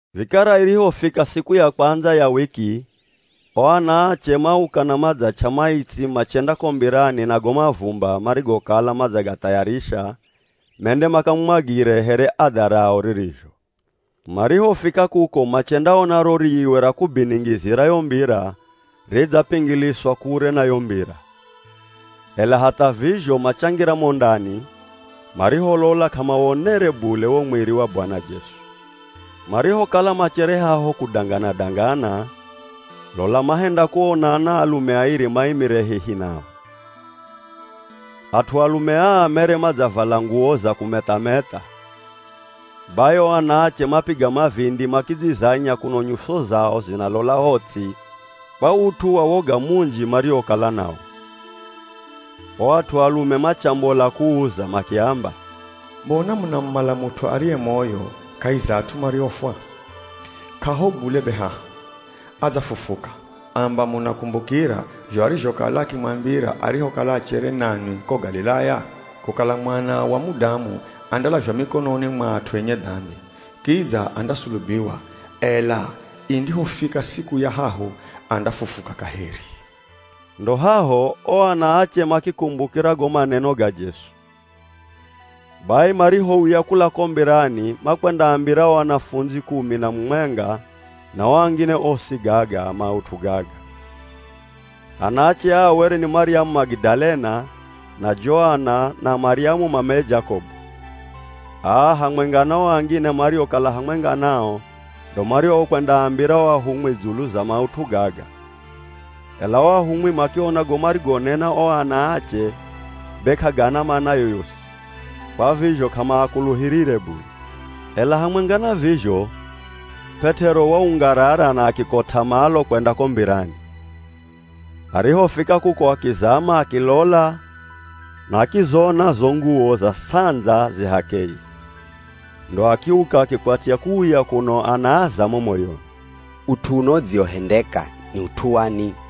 Vikara irihofika siku ya kwandza ya wiki o anaache mauka na madzach'a maitsi machenda ko mbirani na go mavumba marigokala madzagathayarisha mende makamumwagire here adha rao ririzho. Marihofika kuko machendaona ro riiwe ra kubiningizira yo mbira ridzapingiliswa kure na yo mbira. Ela hatha vizho machangira mo ndani, mariholola k'amawonere bule wo mwiri wa Bwana Jesu. Marihokala machere haho kudangana-dangana, lola mahenda kuona anaalume airi maimire hehi nao. At'u alume aa mere madzavala nguwo za kumetha-metha. Bai o anaache mapiga mavindi makidzizanya kuno nyuso zao zinalola ho ts'i kwa ut'u wa woga munji mariokala nawo. O at'u alume machambola kuuza makiamba, “Mbona munamumala mut'u ariye moyo kahi za at'u mariofwa? K'aho bule be haha, adzafufuka! Amba munakumbukira zho arizhokala akimwambira arihokala achere nanwi ko Galilaya? Kukala Mwana wa Mudamu andalazhwa mikononi mwa at'u enye dambi, kidza andasulubiwa, ela indihofika siku ya hahu andafufuka kaheri.” Ndo haho o ana ache makikumbukira go maneno ga Jesu. Bai marihouya kula ko mbirani makwendaambira o anafundzi kumi na mumwenga na o angine osi gaga maut'u gaga. Anaache aa were ni Maryamu Magidalena na Joana, na Maryamu mameye Jakobu. Aa hamwenga na o angine mariokala hamwenga nao ndo mariokwendaambira o ahumwi dzulu za maut'u gaga. Ela o ahumwi makiona go marigonena o ana ache be k'agana mana yoyosi, kwa vizho k'amaakuluhirire bule. Ela hamwenga na vizho, P'et'ero waungarara na akikot'a malo kwenda ko mbirani. Arihofika kuko akizama akilola na akizona zo nguwo za sandza zi h'akeye. Ndo akiuka akikwatya kuuya kuno anaaza mo moyoni, “Ut'u uno udziwohendeka ni ut'u wani?”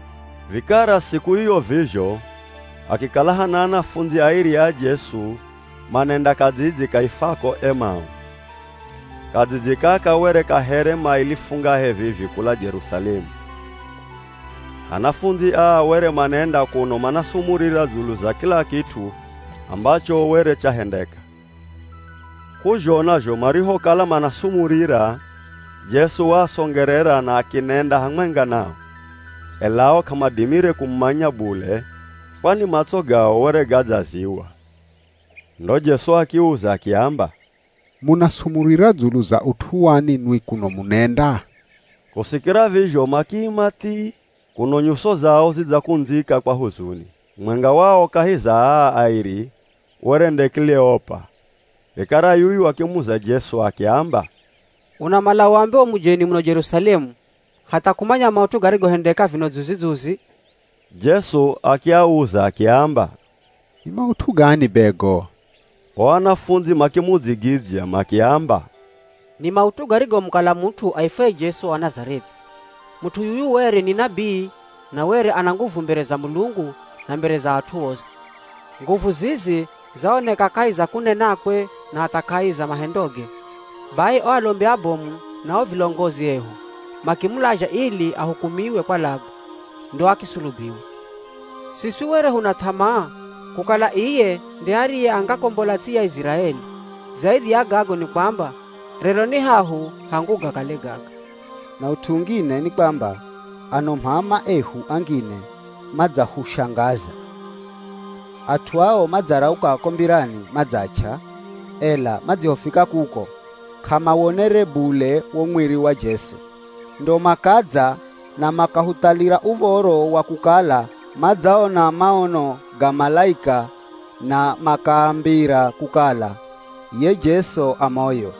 Vikara siku iyo vizho, hakikala hana anafundzi airi a Jesu manenda kadzidzi kaifwako Emau. Kadzidzi kaka were ka here maili fungahe vivi kula Jerusalemu. Anafundzi aa were manenda kuno manasumurira dzulu za kila kit'u ambacho were chahendeka. K'uzhona zho marihokala manasumurira, Jesu waasongerera na akinenda hamwenga nao, ela ao k'amadimire kumumanya bule kwani matso gao were gadzaziywa. Ndo Jesu akiuza akiamba, “Munasumurira dzulu za ut'u wani nwi kuno munenda?” Kusikira vizho makiima thii, kuno nyuso zao zidzakundzika kwa huzuni. Mumwenga wao kahi za aa airi were nde Kileopa. Vikara yuyu akimuza Jesu akiamba, “Unamala uambe u mujeni muno Jerusalemu hatha k'umanya maut'u garigohendeka vino dzuzi-dzuzi?” Jesu akiauza akiamba, “Ni maut'u gani be go?” O anafundzi makimudzigidzya makiamba, “Ni maut'u garigomukalira mut'u aifwaye Jesu wa Nazareth'i. Mut'u yuyu were ni nabii na were ana nguvu mbere za Mulungu na mbere za at'u osi. Nguvu zizi zaoneka kahi za kunenakwe na hatha kahi za mahendoge. Bai o alombi abomu na o vilongozi ehu, makimulazha ili ahukumiwe kwalagwa, ndo akisulubiwa. Siswi were huna th'amaa kukala iye nde ariye angakombola ts'i ya Iziraeli! Zaidhi ya gago ni kwamba rero ni hahu hangu gakale gaga. Na ut'u ungine ni kwamba ano m'ama ehu angine madzahushangaza. At'u ao madzarauka ko mbirani madzach'a, ela madzihofika kuko, k'amawonere bule wo mwiri wa Jesu. Ndo makadza na makahuthalira uv̱oro wa kukala madzaona maono ga malaika na makaambira kukala ye Jesu a moyo!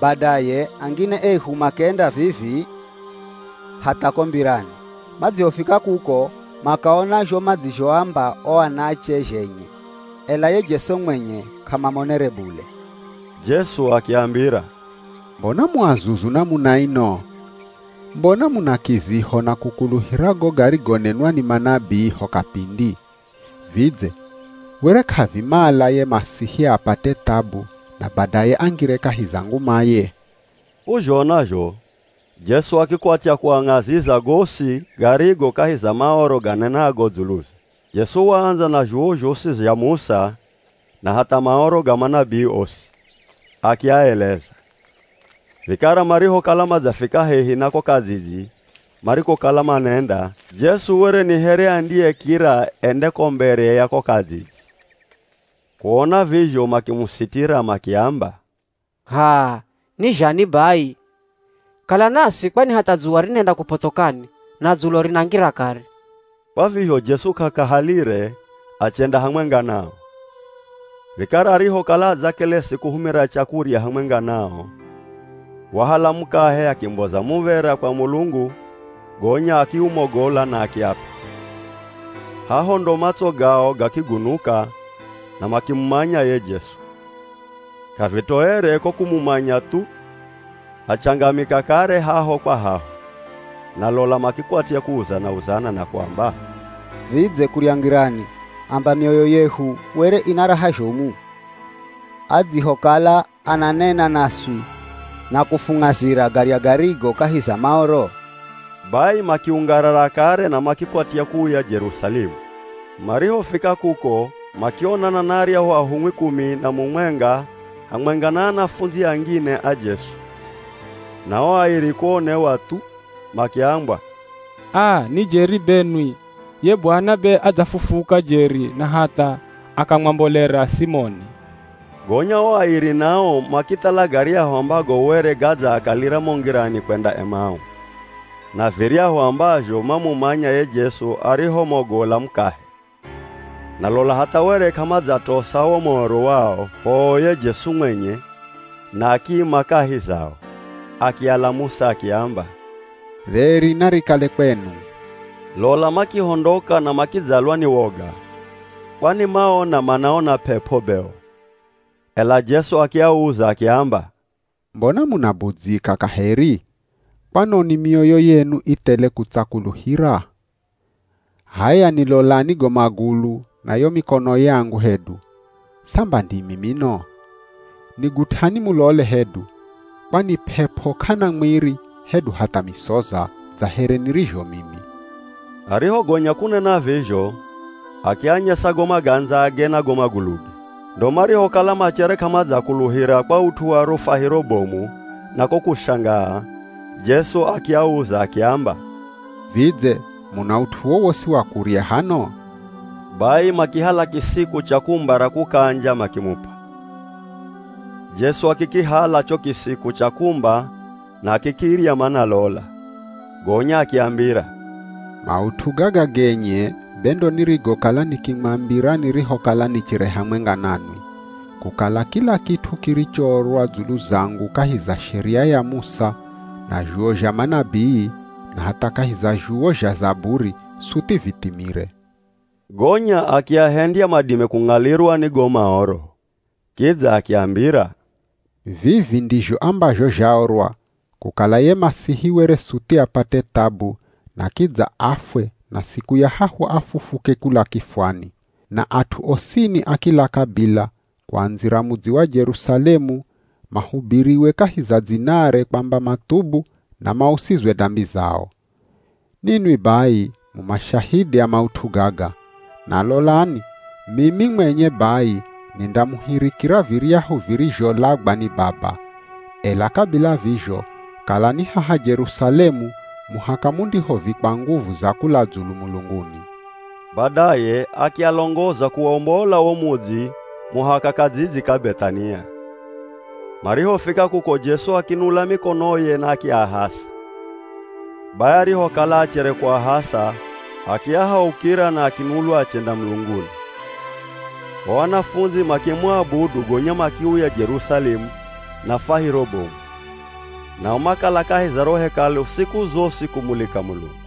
Badaye angine ehu makenda vivii, hatha ko mbirani. Madzihofika kuko makaona zho madzizhoamba o anaache zhenye, ela ye Jesu mwenye k'amamonere bule.” Jesu akiambira, “Mbona mu azuzu namuna ino? Mbona muna kiziho na kukuluhira go garigonenwa ni manabii ho kapindi? Vidze were k'avimala ye Masihi apate thabu na badaye angire kahi za ngumaye?” K'uzhona zho Jesu akikwatya kuang'aziza gosi garigo kahi za Maoro ganenago dzuluze. Jesu waandza na zhuwo zhosi zha Musa na hatha Maoro ga manabii osi, akiaeleza. Vikara marihokala madzafika hehi na ko kadzidzi marikokala manenda, Jesu were ni here andiyekira ende ko mbere ya ko kadzidzi. Kuona vizho makimusitira makiamba, “H'aa, ni zhani bai, kala naswi kwani hatha dzuwa rinenda kupothokani na dzulo rinangira kare.” Kwa vizho Jesu k'akahalire achenda hamwenga nao. Vikara arihokala adzakelesi kuhumira chakurya hamwenga nao, wahala mukahe akimboza muv̱era kwa Mulungu gonya akiumogola na akiap'a. Haho ndo matso gao gakigunuka na makimumanya ye Jesu. K'avitoere, ko kumumanya thu, achangamika kare haho kwa haho Na lola makikwatya kuuzana-uzana na kuamba, “Vidze kurya ngirani amba mioyo yehu were ina raha zhomu, adzihokala ananena naswi na kufung'azira garya garigo kahi za Maoro?” Bai makiungarara kare na makikwatya kuuya Jerusalemu. Marihofika kuko makionana na aryahu ahumwi kumi na mumwenga hamwenga na anafundzi angine a Jesu. Na o airi kuonewa thu makiambwa, “Aa ni jeri benwi! Ye Bwana be adzafufuka jeri na hatha akamwambolera Simoni.” Gonya o airi nao makithala garyahu ambago were gadzaakalira mo ngirani kwenda Emau, na viryahu ambazho mamumanya ye Jesu arihomogola mukahe. Na lola hatha were k'amadzatosa wo moro wao, poo ye Jesu mwenye na akiima kahi zao. Akialamusa akiamba, “Dheri narikale kwenu.” Lola makihondoka na makidzalwa ni woga, kwani maona manaona p'ep'o be o. Ela Jesu akiauza akiamba, “Mbona munabudzyika kaheri? Kwanoni mioyo yenu i thele kutsakuluhira? H'aya nilolani go magulu na yo mikono yangu hedu, samba ndimi mino! Nigut'ani mulole hedu, kwani p'ep'o k'ana mwiri hedu hatha misoza, dza here nirizho mimi.” Arihogonya kunena vizho, akianyesa go magandzage na go maguluge. Ndo marihokala machere k'amadzakuluhira kwa ut'u wa ro fwahiro bomu na ko kushangaa, Jesu akiauza akiamba, “Vidze muna ut'u wowosi wa kurya hano?” Bai makihala kisiku cha kumba ra kukanja makimup'a. Jesu akikihala cho kisiku cha kumba na akikirya manalola. Gonya akiambira, “Maut'u gaga genye be ndo nirigokala nikimwambira nirihokala nichere hamwenga nanwi, kukala kila kit'u kirichoorwa dzulu zangu kahi za Sheria ya Musa na zhuwo zha manabii na hatha kahi za zhuwo zha zaburi suthi vithimire.” Gonya akiahendya madime kung'alirwa ni go Maoro. Kidza akiambira, “Vivi ndizho ambazho zhaorwa, kukala ye Masihi were suthi apate thabu na kidza afwe na siku ya hahu afufuke kula kifwani. Na at'u osini a kila kabila, kuandzira mudzi wa Jerusalemu mahubiriwe kahi za dzinare kwamba mathubu na mausizwe dambi zao. Ninwi bai mu mashahidhi a maut'u gaga. Na lolani mimi mwenye bai nindamuhirikira viryahu virizholagwa ni Baba. Ela kabila vizho, kalani haha Jerusalemu muhaka mundihovikwa nguvu za kula dzulu mulunguni.” Badaye akialongoza kuwombola wo mudzi muhaka kadzidzi ka Beth'ania, marihofika kuko Jesu akinula mikonoye na akiahasa. Bai arihokala achere kuahasa akiahaukira na akinulwa achenda mulunguni. O anafundzi makimuabudu gonya makiuya Jerusalemu na fwahiro bomu. Nao makala kahi za ro Hekalu siku zosi kumulika Mulungu.